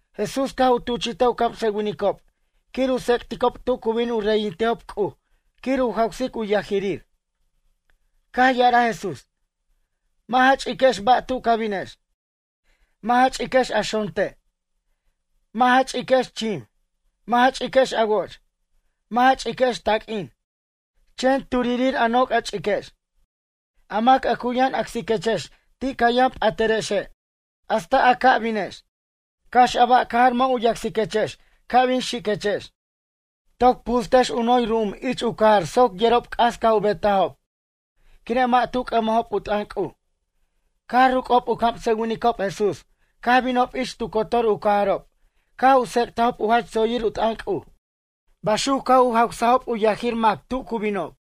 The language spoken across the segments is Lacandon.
Jesús caj u tuchi'taj u camsʌwinicob quir u tsec'ticob tu cu bin u reyintejob C'uj quir u jawsic u yajirir. Caj ya'araj Jesús: ―Mʌ' ja ch'iquex ba' tu ca binex. Mʌ' ja ch'iquex a xonte'. Mʌ' ja ch'iquex chim. Mʌ' ja ch'iquex a woch. Mʌ' ja ch'iquex taq'uin. Chen turirir' a noc' a ch'iquex. A mac a cu yʌn acsiquechex ti' ca yʌn p'atʌrexe' hasta a ca' binex. Cax a ba' cajar mʌ' u yacsiquechex ca' bin xiquechex, toc pustex u noy ru'um ich u cajar soc yerob c'as caj u betajob quire' mʌ' tu c'ʌmajob u t'ʌn C'uj. Caj ruc'ob u camsʌwinicob Jesús caj binob ich tu cotor u cajarob caj u tsec'tajob u jach tsoyir u t'ʌn C'uj. Baxuc caj u jawsajob u yajir mac tu cu binob.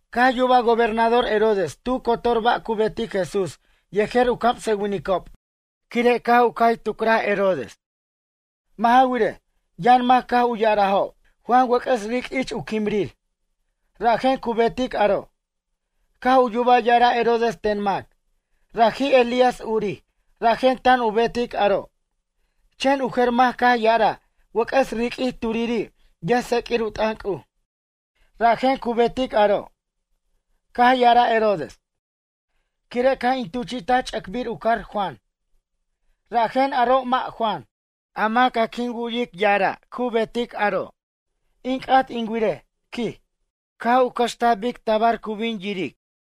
Caj yubaj gobernador Herodes tu cotor ba' cu betic Jesús yejer u camsʌwinicob quire' caj u cay tucric Herodes. Mʌ' ja wirej, yʌn mac caj u ya'arajo': “Juan wʌc'ʌs ric' ich u quimrir. Rajen cu betic aro'.” Caj u yuba ya'ara' Herodes ten mac: “Raji' Elías urij, rajen tan u betic aro'.” Chen u jer mac caj ya'araj: “Wʌc'ʌs riq'uij turiri' yʌjtseq'uir u t'ʌn C'uj, rajen cu betic aro'.” Caj ya'araj Herodes: ―Quire' caj in tuchi'taj ch'ʌcbir u car Juan, rajen aro' mʌ' Juan. A mac a quin wu'yic ya'are' cu betic aro'? In c'at in wirej ―quij. Caj u cʌxtaj bic tabar cu bin yiric.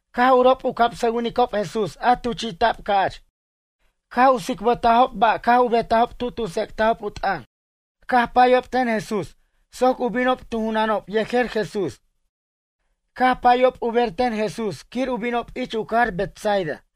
Caj urob u camsʌwinicob Jesús a tuchi'ta'b ca'ch caj u tsicbʌtajob ba' caj u betajob tu tu tsec'tajob u t'ʌn. Caj payob ten Jesús soc u binob tu junanob yejer Jesús. Caj payob u ber ten Jesús quir u binob ich u cajar Betsaida.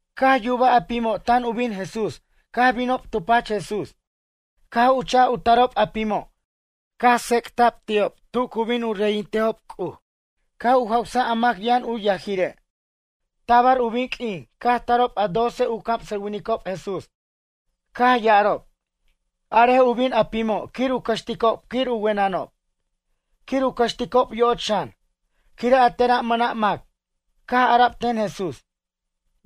Caj yubaj a pimo' tan u bin Jesús caj binob tu pach Jesús, caj u cha'a u tarob a pimo' caj tsec'ta'b ti'ob tu cu bin u reyintejob C'uj. Caj u jawsaj a mac yʌn u yajire'. Tabar u bin q'uin, caj tarob a doce u camsʌwinicob Jesús. Caj ya'arob: ―Arej u bin a pimo' quir u cʌxticob quir u wenʌnob, quir u cʌxticob yoch xan. Quire' a tera' mʌna' mac. Caj ara'b ten Jesús: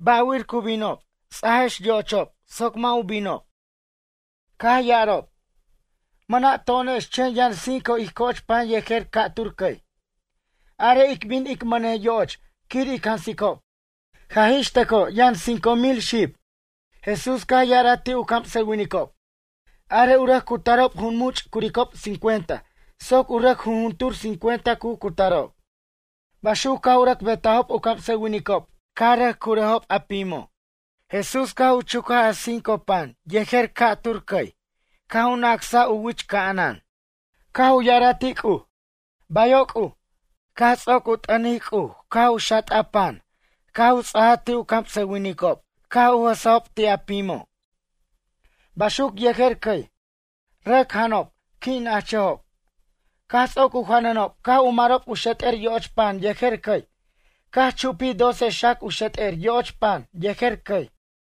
―Bʌ' wir cu binob, techex ts'ajex yo'ochob soc mʌ' u binob. Caj ya'arob: ―Mʌna' to'onex chen yʌn cinco ij coch pan yejer ca'tur cʌy. Arej ic bin ic mʌnej yoch quir ic jansicob. Jaj ixtʌco yʌn cinco mil xib. Jesús caj ya'araj ti' u camsʌwinicob: ―Arej u rʌc cutarob jun much' curicob cincuenta soc u rʌc jujuntur cincuenta cu cutarob. Baxuc caj u rʌc betajob u camsʌwinicob caj rʌc curajob a pimo'. Jesús caj u chucaj a cinco pan yejer dos cʌy caj u nacsaj u wich ca'anan. Caj u ya'araj ti' C'uj: ―Bayo' C'uj. Caj ts'oc u t'ʌnic caj u xat'aj pan caj u ts'aj ti' u camsʌwinicob caj u jʌsejob ti' a pimo'. Baxuc yejer cʌy. Rʌc janob qui' nachʌjob. Caj ts'oc u janʌnob caj u marob u xet'er yoch pan yejer cʌy. Caj chupij doce xac u xet'er yoch pan yejer cʌy.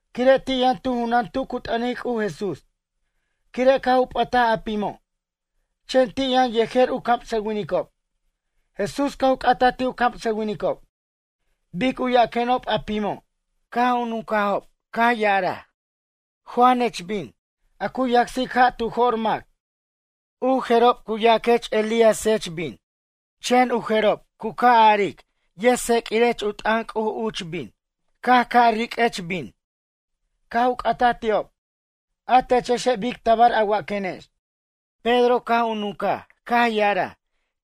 Quire' ti' yʌn tu junan tu cu t'ʌnic C'uj Jesús, quire' caj u p'ʌtaj a pimo'. Chen ti' yʌn yejer u camsʌwinicob. Jesús caj u c'ataj ti' u camsʌwinicob: ―Bic u yaquenob a pimo'? Caj u nuncajob caj ya'araj: ―Juanech, bin, a cu yacsic ja' tu jo'r mac. U jerob cu yaquech Elíasech, bin, chen u jerob u ca' aric yʌjtseq'uirech u t'ʌn C'uj uch, bin, ca' riq'uech, bin. Caj u c'ataj ti'ob: ―A techexe' bic tabar a waquenex? Pedro, caj u nuncaj, caj ya'araj: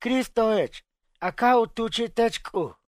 ―Cristojech a caj u tuchi'tech C'uj.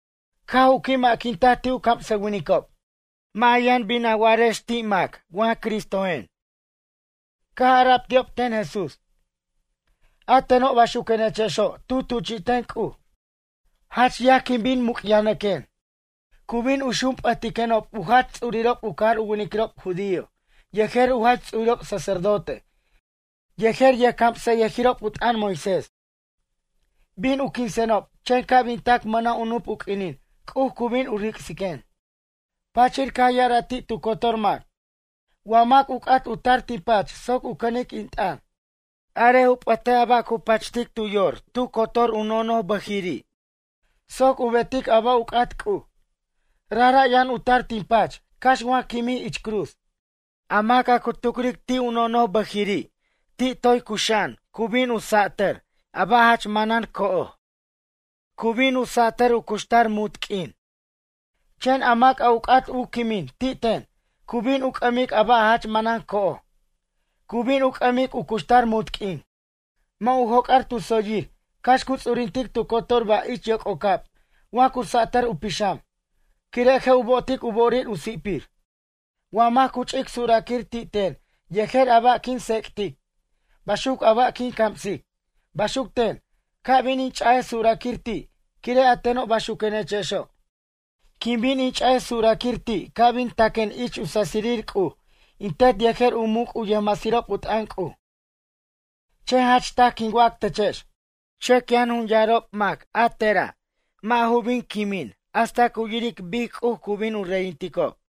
Caj u qui' ma'quintaj ti' u camsʌwinicob: ―Mʌ' a yʌn bin a wa'arex ti' mʌna' mac wa Cristojen. Caj ara'b ti'ob ten Jesús: ―A teno' baxuquenechexo' tu tuchi'ten C'uj, jach yaj quin bin muc'yajnʌquen. Cu bin u xunp'ʌtiquenob u jach ts'urirob u cajar u winiquirob judío yejer u jach ts'urirob sacerdote yejer yʌjcamsʌyʌjirob u t'ʌn Moisés. Bin u quinsenob chen ca' bin tac mʌna' u nup u q'uinin C'uj cu bin u ric'siquen. Pachir caj ya'araj ti' tu cotor mac: ―Wa mac u c'at u tar tin pach soc u cʌnic in t'ʌn. Arej u p'ʌtej a ba' cu pachtic tu yor tu cotor u nonobʌjiri' soc u betic a ba' u c'at C'uj. Rajra' yʌn u tar tin pach cax wa quimij ich cruz. A mac a cu tucric ti' u nonobʌjiri' ti' toy cuxa'an cu bin u satar a ba' jach manan co'oj. Cu bin u satar u cuxtar munt q'uin. Chen a mac a u c'at u quimin ti' ten cu bin u c'ʌmic a ba' jach manan co'oj, cu bin u c'ʌmic u cuxtar munt q'uin. Mʌ' u joc'ar tu tsoyir cax cu ts'urintic tu cotor ba' ich yoc'ocab wa cu satʌr u pixam. Quire' je' u bo'otic u bo'orir u si'pir. Wa mac cu ch'ic suraquir ti' ten yejer a ba' quin tsec'tic, baxuc a ba' quin camsic. Baxuc ten, ca' bin in ch'a'aj suraquir ti' quire' a teno' baxuquenechexo'. Quin bin in ch'a'aj suraquir ti' ca' bin taquen ich u sasirir C'uj in Tet yejer u muc' u yʌjmasirob u t'ʌn C'uj. Chen jach taj quin wac techex. Chʌc yʌn jun yarob mac a tera' mʌ' ju bin quimin hasta cu yiric bic C'uj cu bin u reyinticob.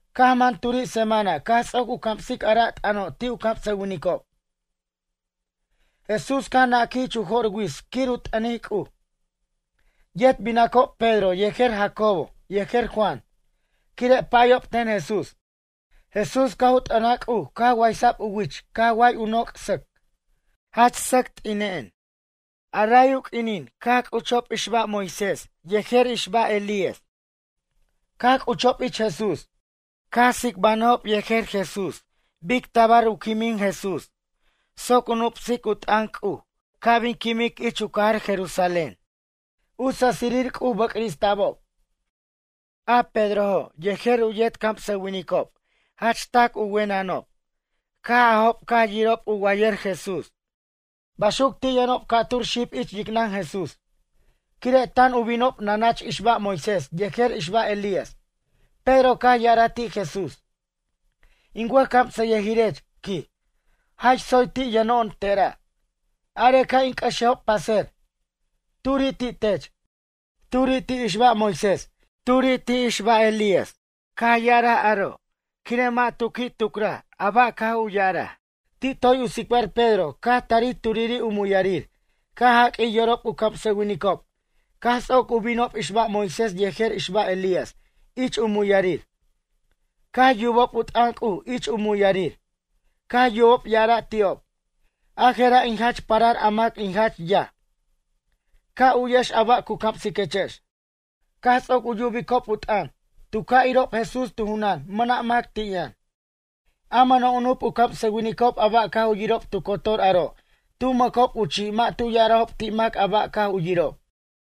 Caj man turi' semana caj ts'oc u camsic a ra' t'ʌno' ti' u camsʌwinicob. Jesús caj naquij ich jo'r wits quir u t'ʌnic C'uj. Yet binacob Pedro yejer Jacobo yejer Juan, quire' payob ten Jesús. Jesús caj u t'ʌnaj C'uj caj waysa'b u wich caj way u noc' sʌc, jach sʌc t'ina'an. Ray u q'uinin caj c'uchob ixba' Moisés yejer ixba' Elías. Caj c'uchob ich Jesús. Caj u tsicbanʌjob yejer Jesús bic tabar u quimin Jesús soc u nupsic u t'ʌn C'uj ca' bin quimic ich u cajar Jerusalén. U sasirir C'uj bʌcrista'bob. A Pedrojo' yejer u yet camsʌwinicob jach p'encʌch tar u wenʌnob caj ajob caj yirob u wayʌr Jesús. Baxuc ti' yʌnob ca'tur xib ich yicnʌn Jesús. Quire' tan u binob nanach ixba' Moisés yejer ixba' Elías, Pedro caj ya'araj ti' Jesús: ―In wʌjcamsʌyʌjirech ―quij―. Jach tsoy ti' yʌno'on tera'. Are ca' in c'ʌxejob pʌser. Turi' ti' tech. Turi' ti' ixba' Moisés. Turi' ti' ixba' Elías. Caj ya'araj aro' quire' mʌ' tu qui' tucraj a ba' caj u ya'araj. Ti' toy u tsicbar Pedro caj tari turiri' u muyarir caj jaq'uij yorob u camsʌwinicob caj ts'oc u binob ixba' Moisés yejer ixba' Elías ich u muyarir. Caj yubob u t'ʌn C'uj ich u muyarir. Caj yubob ya'ara' ti'ob: ―A je'ra' in jach parar a mac in jach yaj. Ca' u'yex a ba' cu camsiquechex. Caj ts'oc u yubicob u t'ʌn tu ca' irob Jesús tu junan mʌna' mac ti' yʌn. A mʌna' u nup u camsʌwinicob a ba' caj u yirob tu cotor aro' tu mʌcob u chi' mʌ' tu ya'arajob ti' mac a ba' caj u yirob.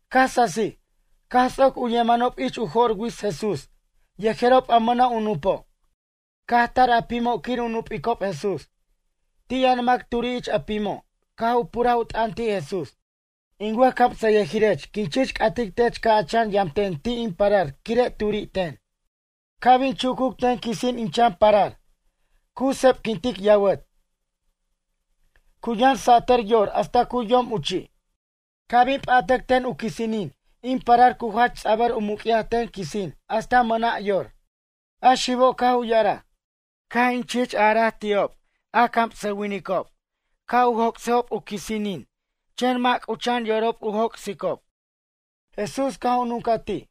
Caj sasij, caj ts'oc u yemanob ich u jo'r wits Jesús yejerob a mʌna' u nupo'. Caj tar a pimo' quir u nup'icob Jesús. Ti' yʌn mac turi' ich a pimo' caj u puraj u t'ʌn ti' Jesús: ―In wʌjcamsʌyʌjirech quin chich c'atic tech ca' a chan yamten ti' in parar quire' turi' ten. Ca' bin chucuc ten quisin in chan parar. Cu sepquintic yawʌt, cu yʌn satʌr yor hasta cu yom u chi'. Ca' bin p'atʌc ten u quisinin in parar cu jach ts'abʌr u muc'yaj ten quisin hasta mʌna' yor. A xibo' caj u ya'araj: ―Caj in chich araj ti'ob a camsʌwinicob ca' u joc'sejob u quisinin chen mʌ' c'ucha'an yorob u joc'sicob. Jesús caj u nuncaj ti':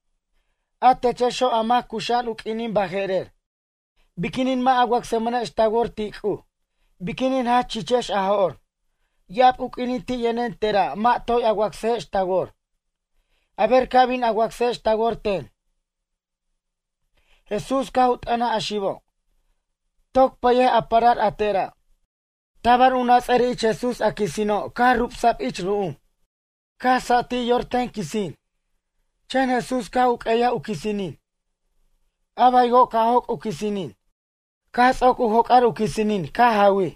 ―A techexo' a mac cuxa'an u q'uinin baje'rer. Biquinin mʌ' a wacsmʌnex ta wor ti' C'uj? Biquinin jach chichex a jo'r? Ya'ab u q'uinin ti' yʌnen tera' mʌ' toy a wacsejex ta wor. A ber ca' bin a wacsex ta wor ten. Jesús caj u t'ʌnaj a xibo': ―Toc pʌyej a parar a te'ra'. Tabar u nats'ʌr ich Jesús a quisino' caj rubsaj ich ru'um. Caj satij yor ten quisin. Chen Jesús caj u q'ueyaj u quisinin. A baywo' caj joc' u quisinin. Caj ts'oc u joc'ar u quisin caj jawij,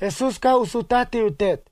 Jesús caj u sutaj ti' u tet.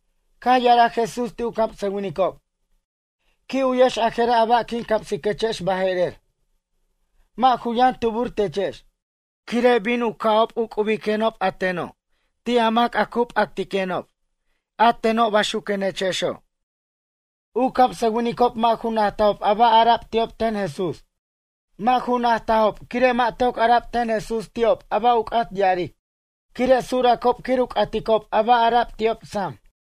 Caj ya'araj Jesús ti' u camsʌwinicob: ―Qui' uyex a je'ra' a ba' quin camsiquechex baje'rer. Mʌ' ju yʌn tubur techex. Quire' bin u ca'ob u c'ubirenob a teno' ti' a mac a cu p'actiquenob a teno' bayxuquenechexo'. U camsʌwinicob mʌ' ju najtajob a ba' ara'b ti'ob ten Jesús. Mʌ' ju najtajob quire' mʌ' toc ara'b ten Jesús ti'ob a ba' u c'at ya'aric. Quire' suracob quir u c'aticob a ba' ara'b ti'ob sam.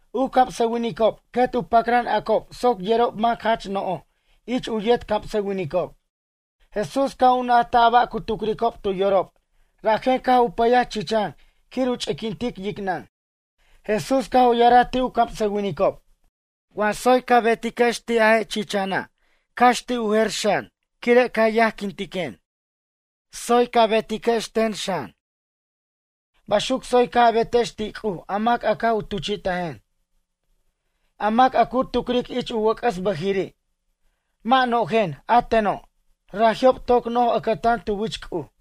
U camsʌwinicob quet u pacran acob soc yerob mac jach no'jo' ich u yet camsʌwinicob. Jesús caj u najtaj a ba' cu tucricob tu yorob rajen caj u pʌyaj chichan quir u ch'iquintic yicnʌn. Jesús caj u ya'araj ti' u camsʌwinicob: ―Wa tsoy ca betiquex ti' a je' chichana' cax ti' u jer xan quire' ca yajquintiquen. Tsoy ca betiquex ten xan. Baxuc tsoy caj a betex ti' C'uj a mac caj u tuchi'tajen. A mac a cu tucric ich u wʌc'ʌs bʌjiri': “Mʌ' no'jen a teno'”, raji'o' toc no'j ʌcʌtan tu wich C'uj.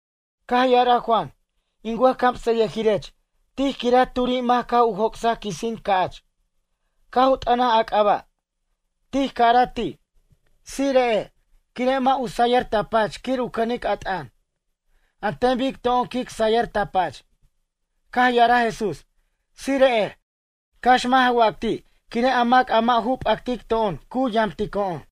Caj ya'araj Juan: ―In wʌjcamsʌyʌjirech, tij quiraj turi' mac caj u joc'saj quisin ca'ch. Caj u t'ʌnaj a c'aba'. Tij caraj ti': “Tsire'ej” quire' mʌ' u sayʌr ta pach quir u cʌnic a t'ʌn. An ten bic to'on quic sayʌr ta pach. Caj ya'araj Jesús: ―Tsire'ej, cax mʌ' ja wac ti' quire' a mac a mʌ' u p'actic to'on cu yamtico'on.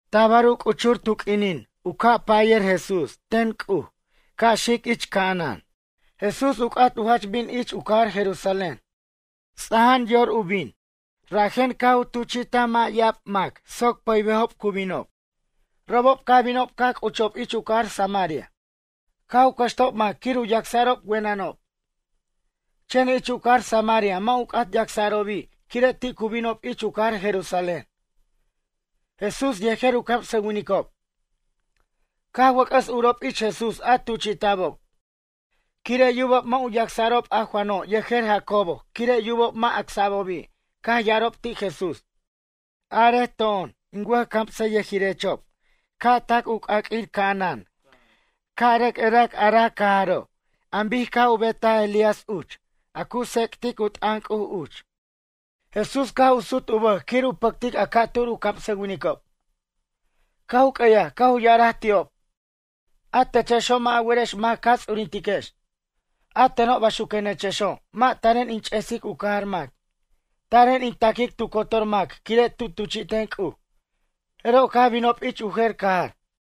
Tabar u c'uchur tu q'uinin u ca' payʌr Jesús ten C'uj ca' xic ich ca'anan. Jesús u c'at u jach bin ich u cajar Jerusalén. Ts'ajan yor tar u bin. Rajen caj u tuchi'taj mʌ' ya'abir mac soc pʌybejob cu binob. Robob caj binob caj c'uchob ich u cajar Samaria, caj u cʌxtajob mac quir u yacsa'rob wenʌnob. Chen ich u cajar Samaria mʌ' u c'at yacsa'robi' quire' ti' cu binob ich u cajar Jerusalén, Jesús yejer u camsʌwinicob. Caj wʌc'ʌs urob ich Jesús a tuchi'ta'bob. Quire' yubob mʌ' u yacsa'rob a Juano' yejer Jacobo quire' yubob mʌ' acsa'bobi' caj ya'arob ti' Jesús: ―Arej to'on in wʌjcamsayʌjirechob ca' tac u c'aq'uir ca'anan ca' rʌc erac ara' cajaro' an bic caj u betaj Elías uch, a cu tsec'tic u t'ʌn C'uj uch. Jesús caj u sut u bʌj quir u pʌctic a ca'tur u camsʌwinicob. Caj u q'ueyaj caj u ya'araj ti'ob: ―A techexo' mʌ' a werex mac ca ts'urintiquex. A teno' baxuquenechexo' mʌ' taren in ch'esic u cajar mac, taren in ta'quic tu cotor mac quire' tu tuchi'ten C'uj. Jeroj caj binob ich u jer cajar.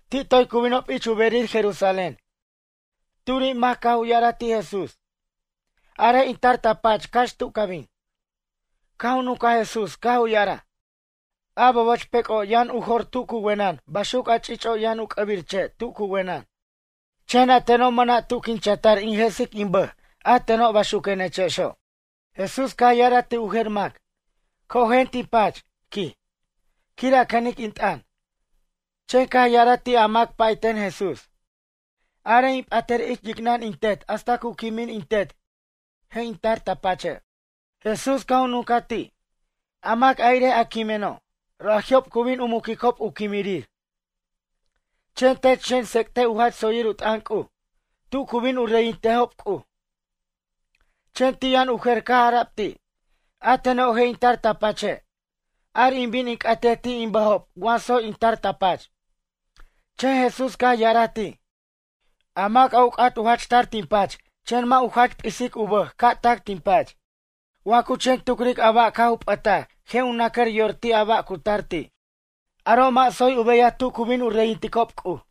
Ti' toy cu binob ich u berir Jerusalén. Turi' mac caj u ya'araj ti' Jesús: ―Arej in tar ta pach cax tu ca bin. Caj u nuncaj Jesús caj u ya'araj: ―A boboch pec'o' yʌn u jor tu cu wenʌn baxuc a ch'ich'o' yʌn u c'ʌbir che' tu cu wenʌn. Chen a teno' mʌna' tu quin chatar in jesic in bʌj a teno', baxuquenechexo'. Jesús caj ya'araj ti' u jer mac: ―Cojen tin pach ―quij―, quir a cʌnic in t'ʌn. Chen caj ya'araj ti' a mac pay ten Jesús: ―Arej in p'atʌr ich yicnʌn in tet hasta cu quimin in tet, je' in tar ta pache'. Jesús caj u nuncaj ti': ―A mac a irej a quimeno', raji'ob cu bin u muquicob u quimirir. Chen tech xen tsec'tej u jach tsoyir u t'ʌn C'uj tu cu bin u reyintejob C'uj. Chen ti' yʌn u jer caj ara'b ti': ―A teno' je' in tar ta pache'. Ar in bin in c'atej ti' in bʌjob wa tsoy in tar ta pach. Chen Jesús caj ya'araj ti': ―A mac a u c'at u jach tar tin pach chen mʌ' u jach p'is u bʌj ca' tac tin pach. Wa cu chen tucric a ba' caj u p'ʌtaj je' u nacar yor ti' a ba' a cu tar ti'. Aro' mʌ' tsoy u beyaj tu cu bin u reyinticob C'uj.